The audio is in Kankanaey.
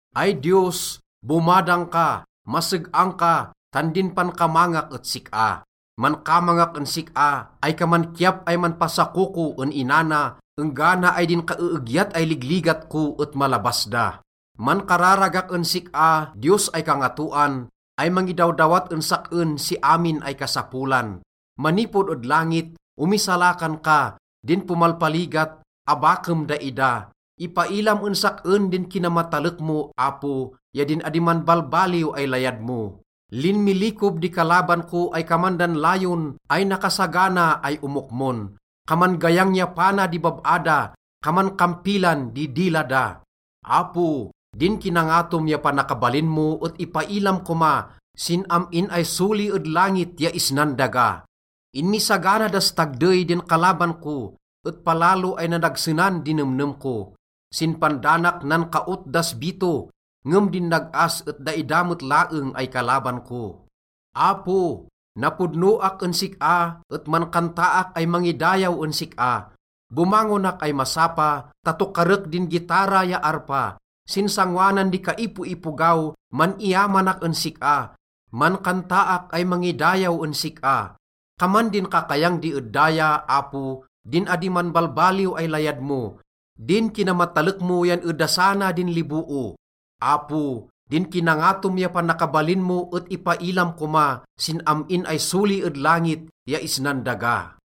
Ay Diyos, bomadang ka, maseg-ang ka, tan din pankamangak et sik-a. Mankamangak en sik-a ay kaman kiyap ay manpasakoko en ina na enggana ay din kaeegyat ay ligligat ko et malabas da. Mankararagak en sik-a, Diyos ay kangatoan, ay mangidawdawat en sak-en si amin ay kasapolan. Manipod ed langit, omisalakan ka, din pomalpaligat, abakem daida. Ipailam en sak-en din kinamatalek mo, Apo, ya din adi manbalbaliw ay layad mo. Linmilikob di kalaban ko ay kaman dan layon ay nakasagana ay omokmon. Kaman gayang ya pana di bab-a da, kaman kampilan di dila da. Apo, din kinangatom ya panakabalin mo et ipailam koma sin am-in ay soli ed langit ya isnan daga. Inmisagana das tagdey din kalaban ko et palalo ay nadagsenan di nemnem ko. Sin pandanak nankaot das bito, ngem din nag-as et daida met laeng ay kalaban ko. Apo, napodnoak en sik-a et mankantaak ay mangidayaw en sik-a. Bomangonak ay masapa ta tokarek din gitara ya arpa. Sin sangoanan di kaipoipogaw, man-iyamanak en sik-a, mankantaak ay mangidayaw en sik-a. Kaman din kakayang di ed daya, Apo, din adi manbalbaliw ay layad mo, din kinamatalek mo yan edasana din liboo. Apo, din kinangatom ya panakabalin mo et ipailam koma sin am-in ay soli ed langit ya isnan daga.